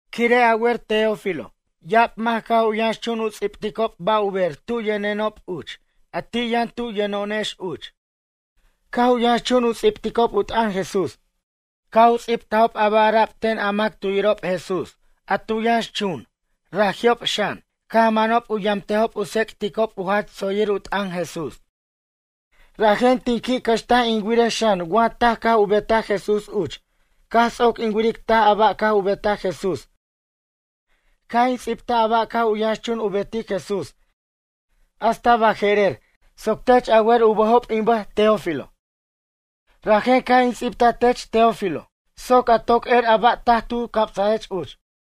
Quire' a wer Teófilo ya'ab mac caj u yʌnxchun u ts'ibticob ba' u ber tu yʌnenob uch a ti' yʌn tu yʌno'onex uch. Caj u yʌnxchun u ts'ibticob u t'ʌn Jesús. Caj u ts'ibtajob a ba' ara'b ten a mac tu yirob Jesús a tu yʌnxchun raji'ob xan caj mʌnob u yamtejob u tsec'ticob u jach tsoyir u t'ʌn Jesús. Rajen tin qui' cʌxtaj in wirej xan wa taj caj u betaj Jesús uch caj ts'oc in wiric taj a ba' caj u betaj Jesús caj in ts'ibtaj a ba' caj u yʌnxchun u betic Jesús hasta baje'rer soc tech a wer u bʌjob in bʌj, Teófilo. Rajen caj in ts'ibtaj tech Teófilo soc a toc er a ba' taj tu camsech uch.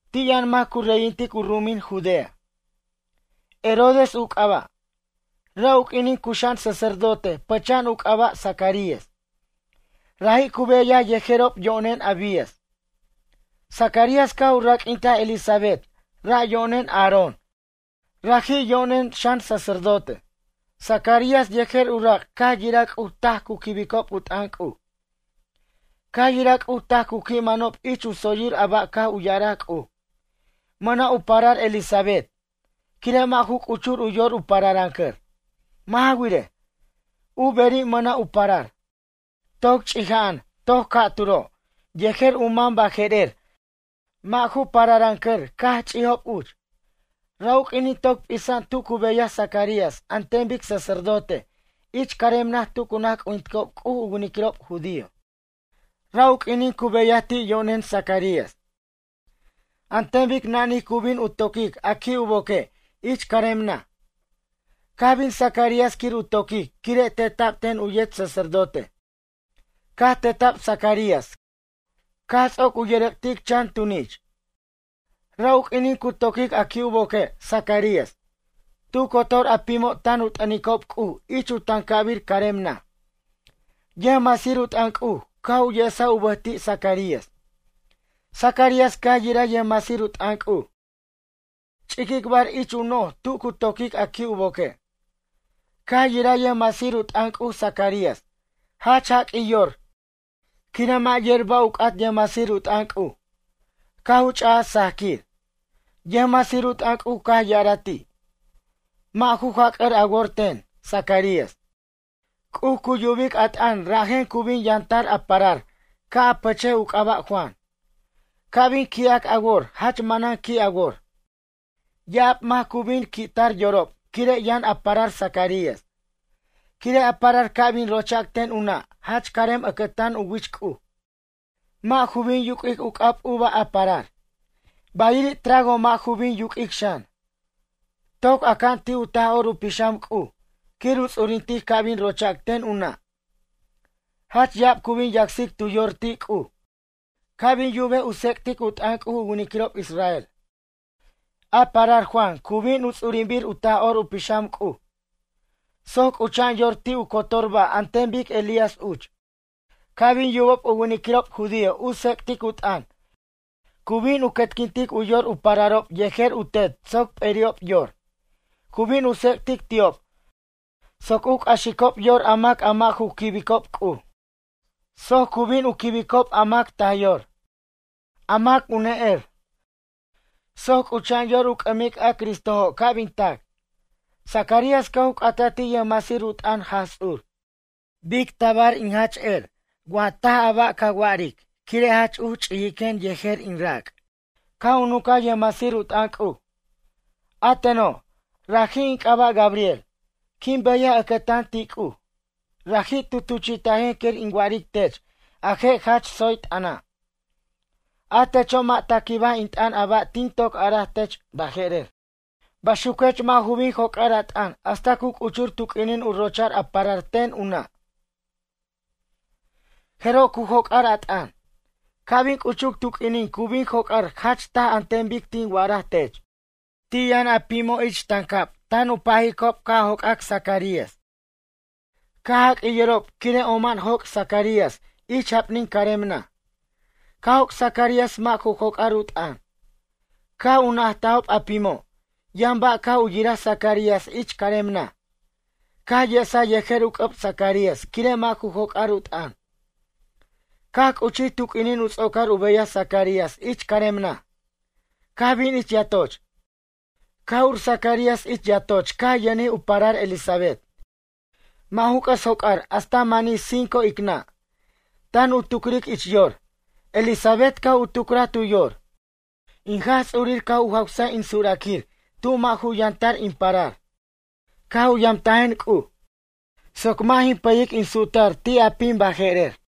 Ti' yʌn mac cu reyintic u ru'umin Judea, Herodes u c'aba'. Ra' u q'uinin cuxa'an sacerdote pʌcha'an u c'aba' Zacarías. Raji' cu beyaj yejerob yo'nen Abías. Zacarías caj u raq'uintaj Elisabet ra' yo'nen Aarón raji' yo'nen xan sacerdote. Zacarías yejer u rac' caj yiraj C'uj taj cu quibicob u t'ʌn C'uj. Caj yiraj C'uj taj cu qui' mʌnob ich u tsoyir a ba' caj u ya'araj C'uj. Mʌna' u parar Elisabet quire' mʌ'ju c'uchur u yor u pararʌncʌr. Mʌ' ja wirej, u beri' mʌna' u parar, toc ch'ija'an toc ca'turo' yejer u mam baje'rer mʌ' ju pararʌncʌr caj ch'ijob uch. Ra' u q'uinin toc p'isa'an tu cu beyaj Zacarías an ten bic sacerdote ich carem naj tu cu naj c'ujinticob C'uj u winiquirob judío. Ra' u q'uinin cu beyaj ti' yo'nen Zacarías. An ten bic nanij cu bin u toquic a qui' u boque' ich carem naj. Caj bin Zacarías quir u toquic quire' teta'b ten u yet sacerdote. Caj teta'b Zacarías caj ts'oc u yʌrʌc'tic chan tunich. Ra' u q'uinin cu toquic a qui' u boque' Zacarías, tu cotor a pimo' tan u t'ʌnicob C'uj ich u tancabir carem naj. Yʌjmasir u t'ʌn C'uj caj u yesaj u bʌj ti' Zacarías. Zacarías caj yiraj yʌjmasir u t'ʌn C'uj, ch'iquicbar ich u noj tu cu toquic a qui' u boque'. Caj yiraj yʌjmasir u t'ʌn C'uj Zacarías jach jaq'uij yor quire' mʌ' yer ba' u c'at yʌjmasir u t'ʌn C'uj caj u ch'aj sajquir. Yʌjmasir u t'ʌn C'uj caj ya'araj ti': ―Mʌ' ju jac'ʌr a wor ten, Zacarías. C'uj cu yubic a t'ʌn rajen cu bin yʌntar a parar ca' a pʌchej u c'aba' Juan. Ca' bin qui'ac a wor jach manan qui' a wor. Ya'ab mac cu bin qui' tar yorob quire' yʌn a parar Zacarías. Quire' a parar ca' bin rochac ten u nʌ' jach carem ʌcʌtan u wich C'uj. Mʌ' ju bin yuq'uic u c'ab uva a parar. Bayiri' trago mʌ' ju bin yuq'uic xan. Toc aca'an ti' u Taj'or u Pixam C'uj quir u ts'urintic ca' bin rochac ten u nʌ'. Jach ya'ab cu bin yacsic tu yor ti' C'uj ca' bin yubej u tsec'tic u t'ʌn C'uj u winiquirob israel. A parar Juan cu bin u ts'urinbir u Taj'or u Pixam C'uj soc c'ucha'an yor ti' tu cotor ba' an ten bic Elías uch. Ca' bin yubob u winiquirob judío u tsec'tic u t'ʌn cu bin u quetquintic u yor u pararob yejer u tet soc p'eri'ob yor. Cu bin u tsec'tic ti'ob soc u c'axicob yor a mac a mʌ' ju quibicob C'uj. Soc cu bin u quibicob a mac taj yor, a mac u ne'er. Soc c'ucha'an yor u c'ʌmic a Cristojo' ca' bin tac. Zacarías caj u c'ataj ti' yʌjmasir u t'ʌn Jaj Ts'ur: ―Bic tabar in jach er taj a ba' ca wac quire' jach uch ch'ijiquen yej in rac'? Caj u nuncaj yʌjmasir u t'ʌn C'uj: ―A teno', raji' in c'aba' Gabriel, quin beyaj ʌcʌtan ti' C'uj. Raji' tu tuchi'tajen quir in wa'aric tech a je' jach tsoy t'ʌna'. A techo' mʌ' ta quibaj in t'ʌn a ba' tin toc a'araj tech baje'rer. Baxuquech mʌ' ju bin joc'ar a t'ʌn hasta cu c'uchur tu q'uinin u rocha'r a parar ten u nʌ'. Jeroj cu joc'ar a t'ʌn. Ca' bin c'uchuc tu q'uinin cu bin joc'ar jach taj an ten bic tin wa'ara tech. Ti' yʌn a pimo' ich tancab tan pajicob ca' joc'ac Zacarías caj jaq'uij yorob quire' oma'an joc' Zacarías ich japnin carem naj. Caj joc' Zacarías mʌ' ju joc'ar u t'ʌn. Caj u najtajob a pimo' yʌn ba' caj u yiraj Zacarías ich carem naj, caj yesa yejer u c'ʌb Zacarías quire' mʌ' ju joc'ar u t'ʌn. Caj c'uchij tu q'uinin u ts'ocar u beyaj Zacarías ich carem naj, caj bin ich yatoch. Caj ur Zacarías ich yatoch caj yʌnjij u parar Elisabet. Mʌ' ju c'ʌs joc'ar hasta manij cinco icnʌ'. Tan u tucric ich yor, Elisabet caj u tucraj tu yor: “In Jaj Ts'urir caj u jawsaj in suraquir tu mʌ' ju yʌn tar in parar. Caj u yamtajen C'uj, soc mʌ' jin pʌyic in su'tar ti' a pim baje'rer.”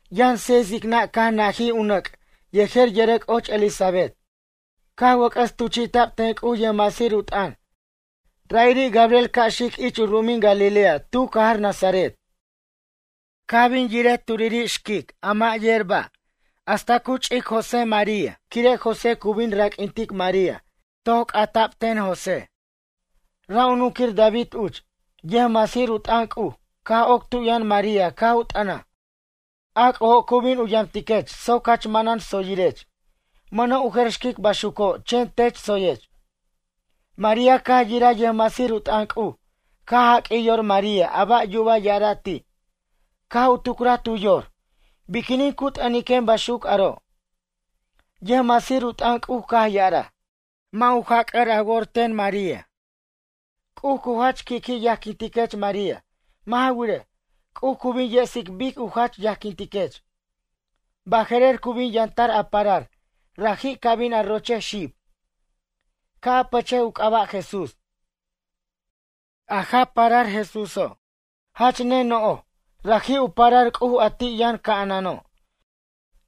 Yʌn seis icnʌ' caj najij u nʌc' yejer yʌrʌc' och Elisabet, caj wʌc'ʌs tuchi'ta'b ten C'uj yʌjmasir u t'ʌn ra'iri' Gabriel ca' xic ich u ru'umin Galilea tu cajar Nazaret. Caj bin yiric turiri' xquic a mʌ' yer ba' hasta cu ch'ic u María quire' José cu bin raq'uintic María toy c'ata'b ten José, ra' u nunquir David uch. Yʌjmasir u t'ʌn C'uj caj oc tu yʌn María caj u t'ʌnaj: ―A C'ujo' cu bin u yamtiquech soc jach manan tsoyirech. Mʌna' u jer xquic baxuco' chen tech tsoyech. María caj yiraj yʌjmasir u t'ʌn C'uj caj jaq'uij yor María a ba' yuba ya'ara' ti'. Caj u tucraj tu yor: “Biquinin cu t'ʌniquen baxuc aro'.” Yʌjmasir u t'ʌn C'uj caj ya'araj: ―Mʌ' ju jac' a wor ten, María, C'uj cu jach qui' qui' yajquintiquech María. Mʌ' ja wirej, C'uj cu bin yesic bic u jach yajquintiquech. Baje'rer cu bin yʌntar a parar raji' ca bin a rochej xib, ca' a pʌchej u c'aba' JESÚS. A'a parar Jesúso' jach ne no'j, raji' u parar C'uj a ti' yʌn ca'anano'.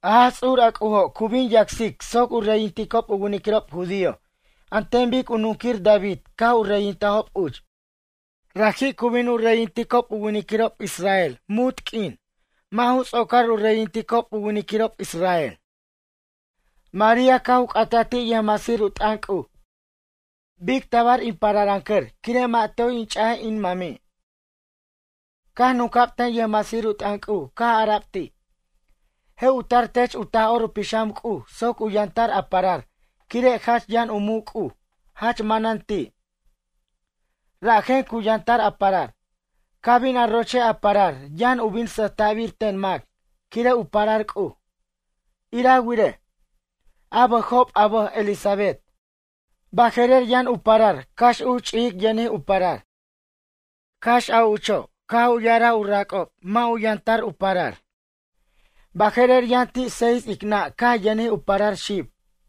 A Jaj Ts'ur a C'ujo' cu bin yacsic soc u reyinticob u winiquirob judío an ten bic u nunquir David caj u reyintajob uch. Raji' cu bin u reyinticob u winiquirob israel munt q'uin mʌ' ju ts'ocar u reyinticob u winiquirob israel. María caj u c'ata ti' yʌjmasir u t'ʌn C'uj: ―Bic tabar in pararʌncʌr quire' mʌ' toy in ch'aj in mami'. Caj nunca'b ten yʌjmasir u t'ʌn C'uj caj ara'b ti': ―Je' u tar tech u Taj'or u Pixam C'uj soc u yʌntar a parar quire' jach yʌn u muc' C'uj jach manan ti', rajen cu yʌntar a parar. Ca' bin a rochej a parar yʌn u bin sʌjta'bir ten mac quire' u parar C'uj. Ira wirej, a bʌjob a bʌj Elisabet baje'rer yʌn u parar cax uch ch'ijic yʌnij u parar. Cax a ucho' caj u ya'araj u rac'ob mʌ' u yʌntar u parar. Baje'rer yʌn ti' seis icnʌ' caj yʌnij u parar xib.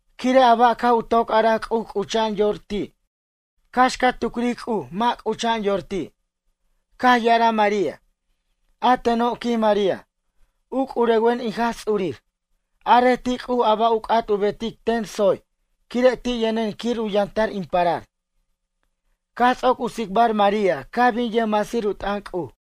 Quire' a ba' caj u toc araj C'uj c'ucha'an yor ti' cax ca tucric C'uj mʌ' c'ucha'an yor ti'. Caj ya'araj María: ―A teno' ―quij María―, u c'urewen in Jaj Ts'urir. Arej ti' C'uj a ba' u c'at u betic ten tsoy quire' ti' yʌnen quir u yʌntar in parar. Caj ts'oc u tsicbar María caj bin yʌjmasir u t'ʌn C'uj.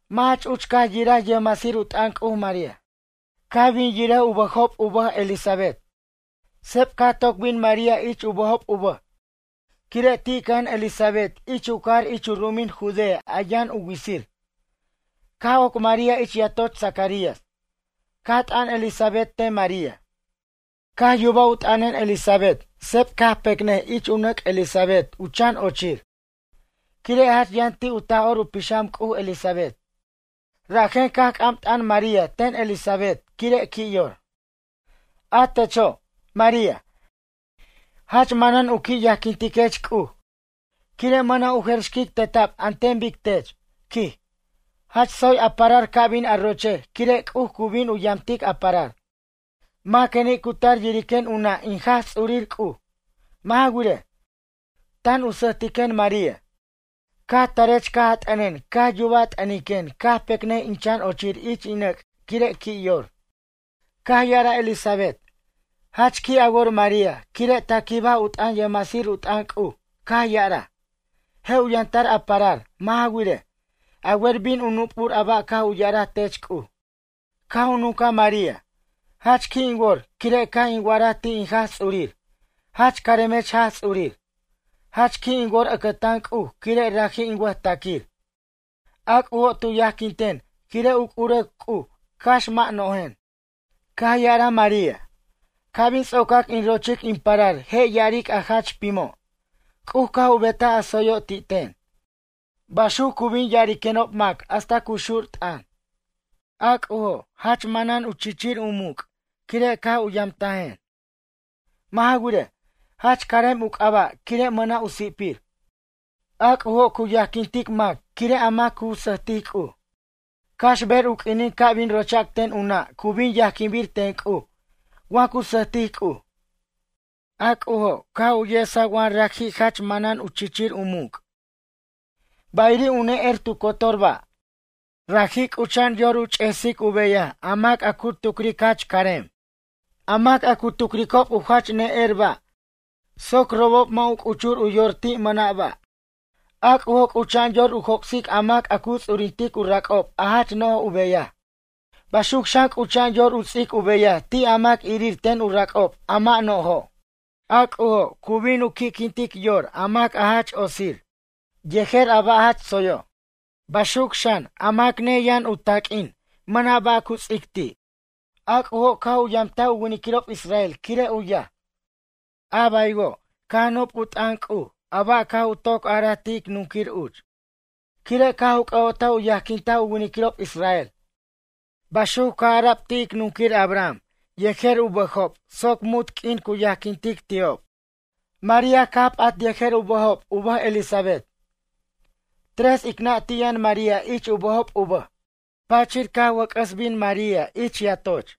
Mʌ' jach uch caj yiraj yʌjmasir u t'ʌn María, caj bin yirej u bʌjob u bʌj Elisabet. Seb caj toc bin María ich u bʌjob u bʌj quire' ti' cʌja'an Elisabet ich u cajar ich u ru'umin Judea a yʌn u witsir. Caj oc María ich yatoch Zacarías. Caj t'ʌn Elisabet ten María. Caj yubaj u t'ʌnʌn Elisabet seb caj pecnʌj ich u nʌc' Elisabet u chan ochir. Quire' jach yʌn ti' u Taj'or u Pixam C'uj Elisabet. Rajen caj c'am t'ʌn María ten Elisabet quire' qui' yor: ―A techo', María, jach manan u qui' yajquintiquech C'uj quire' mʌna' u jer xquic teta'b an ten bic tech ―quij―. Jach tsoy a parar ca' bin a rochej quire' C'uj cu bin u yamtic a parar. Maqueni' cu tar yiriquen u nʌ' in Jaj Ts'urir C'uj? Mʌ' ja wirej, tan u sʌjtiquen María. Caj tarech caj a t'ʌnen caj yubaj a t'ʌniquen caj pecnʌj in chan ochir ich in nʌc' quire' qui' yor. Caj ya'araj Elisabet: ―Jach qui' a wor María quire' ta quibaj u t'ʌn yʌjmasir u t'ʌn C'uj caj ya'araj: “Je' u yʌntar a parar.” Mʌ' ja wirej, a wer bin u nup'ur a ba' caj u ya'ara tech C'uj. Caj u nuncaj María: Jach qui' in wor quire' caj in wa'araj ti' in Jaj Ts'urir: jach caremech Jaj Ts'urir. Jach qui' in wor ʌcʌtan C'uj quire' raji' in wʌjtaquir. A C'ujo' tu yajquin ten quire' u c'urewen C'uj cax mʌ' no'jen. Caj ya'araj María: Ca' bin ts'ocac in rochic in parar je' ya'aric a jach pimo': C'uj caj u betaj a tsoyo' ti' ten. Baxuc cu bin ya'ariquenob mac hasta cu xur t'ʌn. A C'ujo' jach manan chichir u muc' quire' caj u yamtajen. Mʌ' ja wirej, jach carem u c'aba' quire' mʌna' u si'pir. A C'ujo' cu yajquintic mac quire' a mac cu sʌjtic C'uj. Cax ber u q'uinin ca' bin rochac ten u nʌ' cu bin yajquinbir ten C'uj wa cu sʌjtic C'uj. A C'ujo' caj u yesaj wa raji' jach manan chichir u muc', bayiri' u ne'er tu cotor ba'. Raji' c'ucha'an yor u ch'esic u beyaj a mac a cu tucric jach carem, a mac a cu tucricob u jach ne'er ba' soc robob mʌ' u c'uchur u yor ti' mʌna' ba'. A C'ujo' c'ucha'an yor u joc'sic a mac a cu ts'urintic u rac'ob a jach no'j u beyaj. Baxuc xan c'ucha'an yor u ts'ic u beyaj ti' a mac irir ten u rac'ob a mʌ' no'jo'. A C'ujo' cu bin u qui'quintic yor a mac a jach otsir yejer a ba' jach tsoyo'. Baxuc xan a mac neyaj u taq'uin, mʌna' ba' cu ts'ic ti'. A C'ujo' caj u yamtaj u winiquirob israel quire' u yaj. A baywo' caj nup' u t'ʌn C'uj a ba' caj u toc araj ti' ic nunquir uch. Quire' caj u c'ʌ'otaj u yajquintaj u winiquirob israel. Baxuc caj ara'b ti' ic nunquir Abraham yejer u bʌjob soc munt q'uin cu yajquintic ti'ob. María caj p'at yejer u bʌjob u bʌj Elisabet. Tres icnʌ' ti' yʌn María ich u bʌjob u bʌj. Pachir caj u wʌc'ʌs bin María ich yatoch.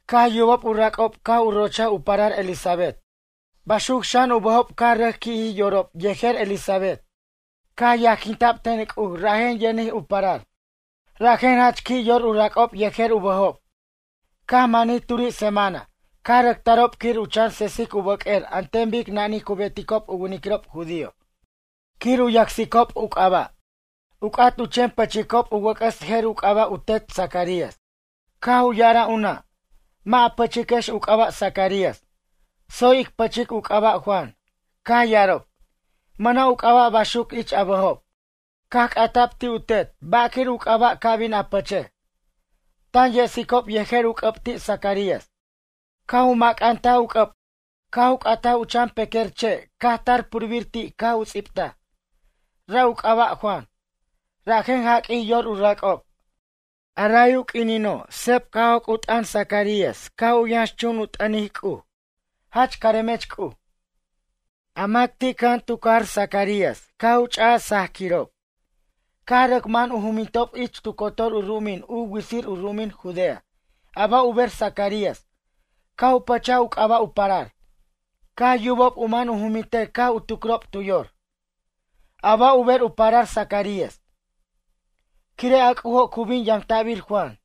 Caj yubob u rac'ob caj u rochaj u parar Elisabet, baxuc xan u bʌjob caj rʌc qui'ji yorob yejer Elisabet. Caj yajquinta'b ten C'uj rajen yʌnij u parar. Rajen jach qui' yor u rac'ob yejer u bʌjob. Caj manij turi' semana caj rʌc tarob quir u chan sesic u bʌq'uer an ten bic nanij cu beticob u winiquirob judío quir u yacsicob u c'aba'. U c'at u chen pʌchicob u wʌc'ʌs jer u c'aba' u tet Zacarías. Caj u ya'araj u nʌ': ―Mʌ' a pʌchiquex u c'aba' Zacarías, tsoy ic pʌchic u c'aba' Juan. Caj ya'arob: ―Mʌna' u c'aba' baxuc ich a bʌjob. Caj c'ata'b ti' u tet ba' quir u c'aba' ca bin a pʌchej, tan yesicob yejer u c'ʌb ti' Zacarías. Caj u mʌcantaj u c'ʌb caj u c'ataj u chan pequer che' caj tar purbir ti' caj u ts'ibtaj: “Ra' u c'aba' Juan.” Rajen jaq'uij yor u rac'ob. Ray u q'uinino' seb caj joc' u t'ʌn Zacarías caj u yʌnxchun u t'ʌnic C'uj: ―Jach caremech C'uj. A mac ti' cʌja'an tu cajar Zacarías caj u ch'aj sajaquirob caj rʌc mʌn u jumintob ich tu cotor u ru'umin u witsir u ru'umin Judea a ba' u ber Zacarías caj u pʌchaj u c'aba' u parar. Caj yubob u mʌn u jumintej caj u tucrob tu yor: ―A ba' u ber u parar Zacarías? Quire' a C'ujo' cu bin yamta'bir Juan.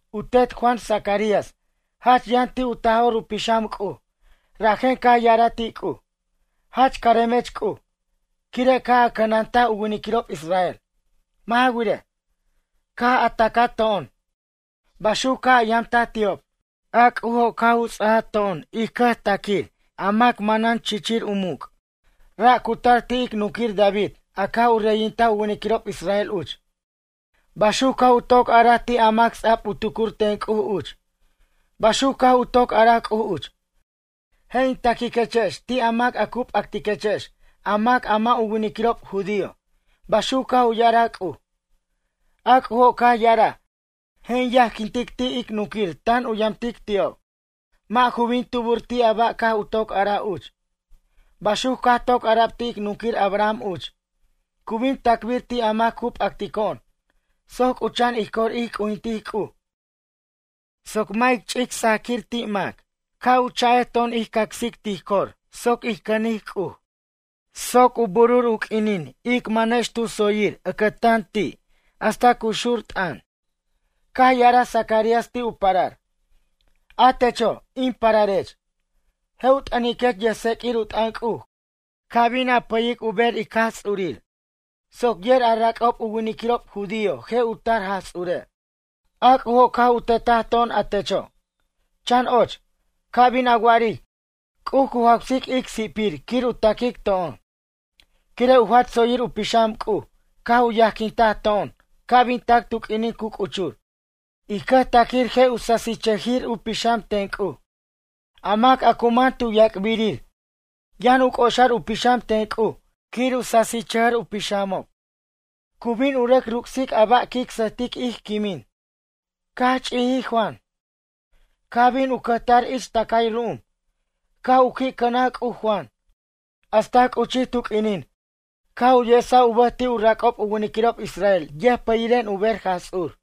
U tet Juan Zacarías jach yʌn ti' u Taj'or u Pixam C'uj, rajen caj ya'araj ti' C'uj: Jach caremech C'uj, quire' caj a cʌnantaj u winiquirob israel. Mʌ' ja wirej, caj a tacato'on baxuc caj a yamtaj ti'ob. A C'ujo' caj u ts'aj to'on ij cʌjtaquir a mac manan chichir u muc'. Ra' cu tar ti' ic nunquir David a caj u reyintaj u winiquirob israel uch. Baxuc caj u toc araj ti' a mac ts'a'b u tucur ten C'uj uch. Baxuc caj u toc araj C'uj uch: “Je' in taquiquechex ti' a mac cu p'actiquechex a mac a mʌ' u winiquirob judío”, baxuc caj u ya'araj C'uj. A C'ujo' caj ya'araj: “Je' in yajquintic ti' ic nunquir tan u yamtic ti'ob. Mʌ' ju bin tubur ti' a ba' caj u toc araj uch.” Baxuc caj toc ara'b ti' ic nunquir Abraham uch: “Cu bin tacbir ti' a mac cu p'actico'on soc c'ucha'an ij cor ij c'ujintic C'uj soc mʌ' ic ch'ic sajaquir ti' mac.” Caj u chajex to'on ij cacsic tij cor soc ij cʌnic C'uj soc u bur u q'uinin ic manex tu tsoyir ʌcʌtan ti' hasta cu xur t'ʌn. Caj ya'araj Zacarías ti' u parar: “A techo', in pararech, je' u t'ʌniquech yʌjtseq'uir u t'ʌn C'uj caj bin a pʌyic u ber ic Jaj Ts'urir soc yer a rac'ob u winiquirob judío je' u tar Jaj Ts'ure'. A C'ujo' caj u tetaj to'on a techo', chan och, ca bin a wa'aric C'uj cu jawsic ic si'pir quir u taquic to'on. Quire' u jach tsoyir u pixam C'uj caj u yajquintaj to'on ca' bin tac tu q'uinin cu c'uchur. Ij cʌjtaquir je' u sasichʌjir u pixam ten C'uj. A mac a cu man tu yac'birir yʌn u c'oxar u pixam ten C'uj quir u sasichʌjir u pixamob. Cu bin u rʌc ruc'sic a ba' quic sʌjtic ij quimin.” Caj ch'ijij Juan caj bin u cʌjtar ich tʌcay ru'um. Caj u qui' cʌnaj C'uj Juan. Hasta c'uchij tu q'uinin caj u yesaj u bʌj ti' u rac'ob u winiquirob israel yʌjpʌyiren u ber Jaj Ts'ur.